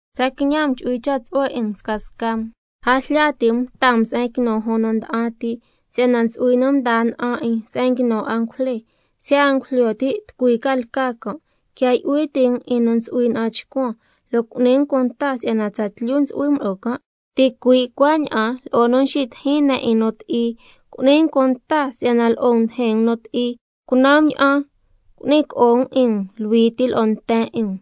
Tsa quiñan um chu'hui cha' tsu'hue 'in um scasca um. A jlya ti' um taa um se'en quinu jun nu nda'an ti, si'yana ntsu'hui nu mdaa na'an 'in se'en nguinu angujle, siya' a ngujlyo ti' tucui ca lca can'. Quia yu'hui ti' um 'in nu ntsu'hui na'an chcuan, lo' cu'ni um cunta si'yana tsatlyu ntsu'hui um lo'o can', ticui' cuaña'an lo'o nu nxitijin ne' 'in nu ti'i, cu'ni um cunta si'yana lo'o um ndijin um nu ti'i. Cunan um ña'an cu'ni co'o um 'in um luhui ti lo'o nten 'in um,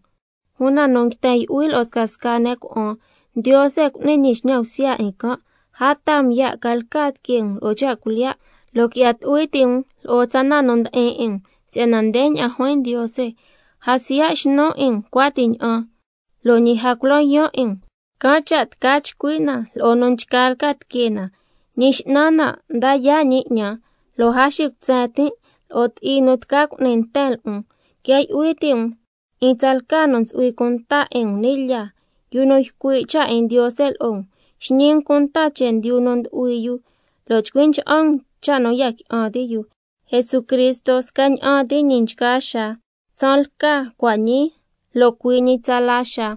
una nu nguiten yu'hui lo'o scasca ne' cuna'an, Ndiose cu'ni ñi xñan bsya 'in can'. A taa um ya' ca lca tiquee um lo'o cha' cuilyiya', lo' qui'ya tu'hui ti' um lo'o tsa na nu ndi'in 'in um, si'yana ndeña'an juin Ndiose: —A siya' xnun 'in um cuati ña'an, lo' ñi a cula yaan' 'in um—. Can' cha' tca chcui' na lo'o nu nchgaa lca tiquee na: —Ñi X'nan na nda yaa' ñi ñan, lo' a xicutsen tin' lo'o ti'i nu tca cu'ni nten lo'on— Quia yu'hui ti' um 'in tsalca nu ntsu'hui cunta 'in um ni' lyaa, yu nu ycui' cha' 'in Ndiose lo'o um, xñi um cunta chendyu nu mdu'hui yu lo' chcui ncha'an um cha' nu ya qui'an ti' yu. Jesucristo scaña'an ti ñi nchgaa xaa: Tsaan lca, cua' ñii, lo' cui' ñi tsala xaa.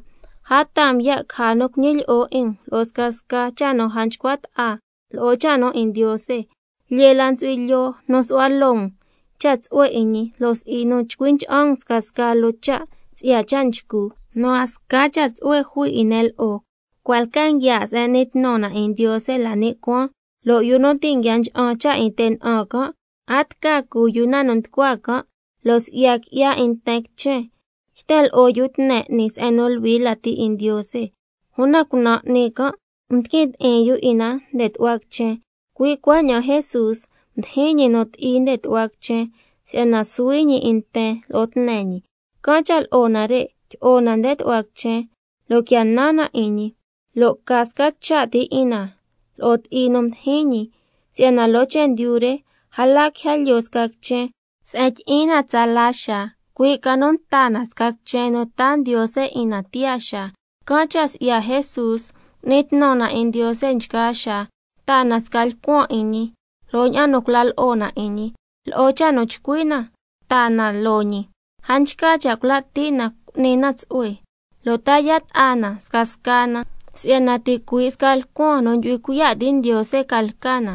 A taa um ya' caja nu cuñilyi'o 'in um lo'o scasca cha' nu a nchcua ta'a lo'o cha' nu 'in Ndiose. Lyee la ntsu'hui lyoo nu su'hua loo um cha' tsu'hue 'in ñi lo' si'i nu chcui ncha'an um scasca loo cha' si'ya cha' nchcu, nu a sca cha' tsu'hue jui 'in ne' lo'o. Nare' ndon sca se'en n'ni tnu na 'in Ndiose la ni' cuaan, lo' yu nu ti' nguia ncha'an cha' 'in te' na'an can', a tca cu yu na nu nducua can'. Lo' si'ya qui'ya 'in nten quichen, yten lo'o yu tne 'ni se'en nu luhui lati 'in Ndiose, una cunan' 'ni can' ndiquin ti'in yu 'in na nde tu'hua quichen. Cui' cuaña'an Jesús mdijin ñi nu ti'i nde tu'hua quichen, si'yana suhui ñi 'in nten lo'o tne ñi. Can' cha' lo'o nare' tyi'o na nde tu'hua quichen lo' quia nan na 'in ñi, lo' ca sca cha' ti 'in na lo'o ti'i nu mdijin ñi. Si'yana loo chendyu re a la quija lyoo sca quichen se'en tyi'in na tsala xaa, cui' ca nu nta na sca quichen nu taa Ndiose 'in na tiyaa xaa. Can' cha' si'ya Jesús, cu'ni tnu na 'in Ndiose nchgaa xaa, taa na sca lcuan 'in ñi lo'o ña'an nu cula lo'o na 'in ñi, lo'o cha' nu chcui' na taa na loo ñi. A nchca cha' cula' ti' na cu'ni na tsu'hue, lo' ta yaa' ta'a na scasca na, si'yana ticui' sca lcuan nu ndyu'hui cuiya' ti' Ndiose ca lca na.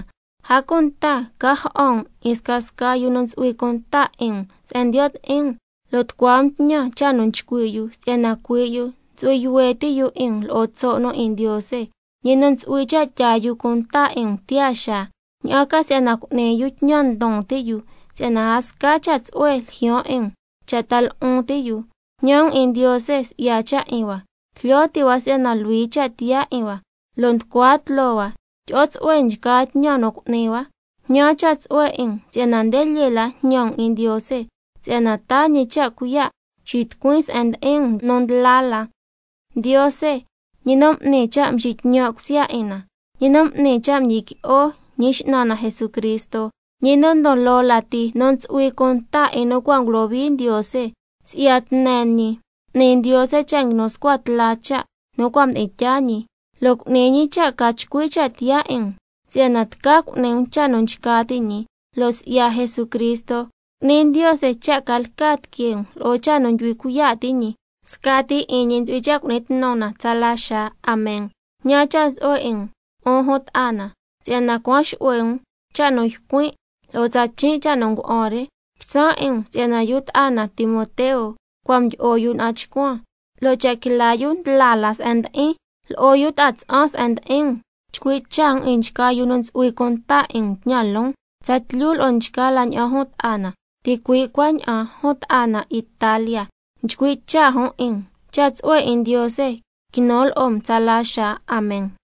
A cunta ca ja'an um 'in scasca yu nu ntsu'hui cunta 'in um se'en ndiyo' ti'in um, lo' tucua um tñan cha' nu nchcui' yu si'yana cui' yu ntsu'hui yuhue ti' yu 'in um lo'o tso' nu 'in Ndiose, ñi nu ntsu'hui cha' tyaa yu cunta 'in um tiyaa xaa, ña'an ca si'yana cu'ni yu tñan ndon ti' yu, si'yana a sca cha' tsu'hue ljyaan 'in um cha' ta lu'un ti' yu. Jñan um 'in Ndiose si'ya cha' 'in hua, jlyo ti' hua si'yana luhui cha' tiyaa 'in hua, lo' nducua tloo hua tyi'o tsu'hue nchgaa tñan nu cu'ni hua. Jñan cha' tsu'hue 'in um si'yana nde lyee la jñan um 'in Ndiose, si'yana taa ñi cha' cuiya' xitucuin se'en ndi'in um nu ndla la. Ndiose, ñi nu n'ni cha' nxitñan' cusya 'in na, ñi nu m'ni cha' mdyiqui'o Ñi X'nan na Jesucristo, ñi nu ndon loo lati nu ntsu'hui cunta 'in nu cua' ngulohui Ndiose, si'ya tne ñi m'ni Ndiose cha' nguinu scua tla cha' nu cua' mdi'in tyaa ñi, lo' cu'ni ñi cha' ca chcui cha' tiyaa 'in um si'yana tca cu'ni um cha' nu nchca ti' ñi, lo' si'ya Jesucristo cu'ni Ndiose cha' ca lca tiquee um lo'o cha' nu ndyu'hui cuiya' ti' ñi, scati 'in ñi ntsu'hui cha' cu'ni tnu na tsala xaa. Amen. Mjñan cha' tsu'hue 'in um, 'un jun ta'a na, si'yana cuan xu'hue um cha' nu ycuin' lo'o tsa chin' cha' nu ngua'an re. Quitsan' 'in um si'yana yu ta'a na Timoteo cua' mdyi'o yu na'an chcuan, lo' cha' quila yu ndla la se'en ndi'in, lo'o yu ta'a tsa'an se'en ndi'in um. Chcui' cha' um 'in nchgaa yu nu ntsu'hui cunta 'in um tñan loon, tsatlyu lo'o nchgaa la ña'an jun ta'a na. Ticui' cuaña'an jun ta'a na Italia nchcui' cha' jun 'in um. Cha' tsu'hue 'in Ndiose quinu lo'o um tsala xaa. Amen.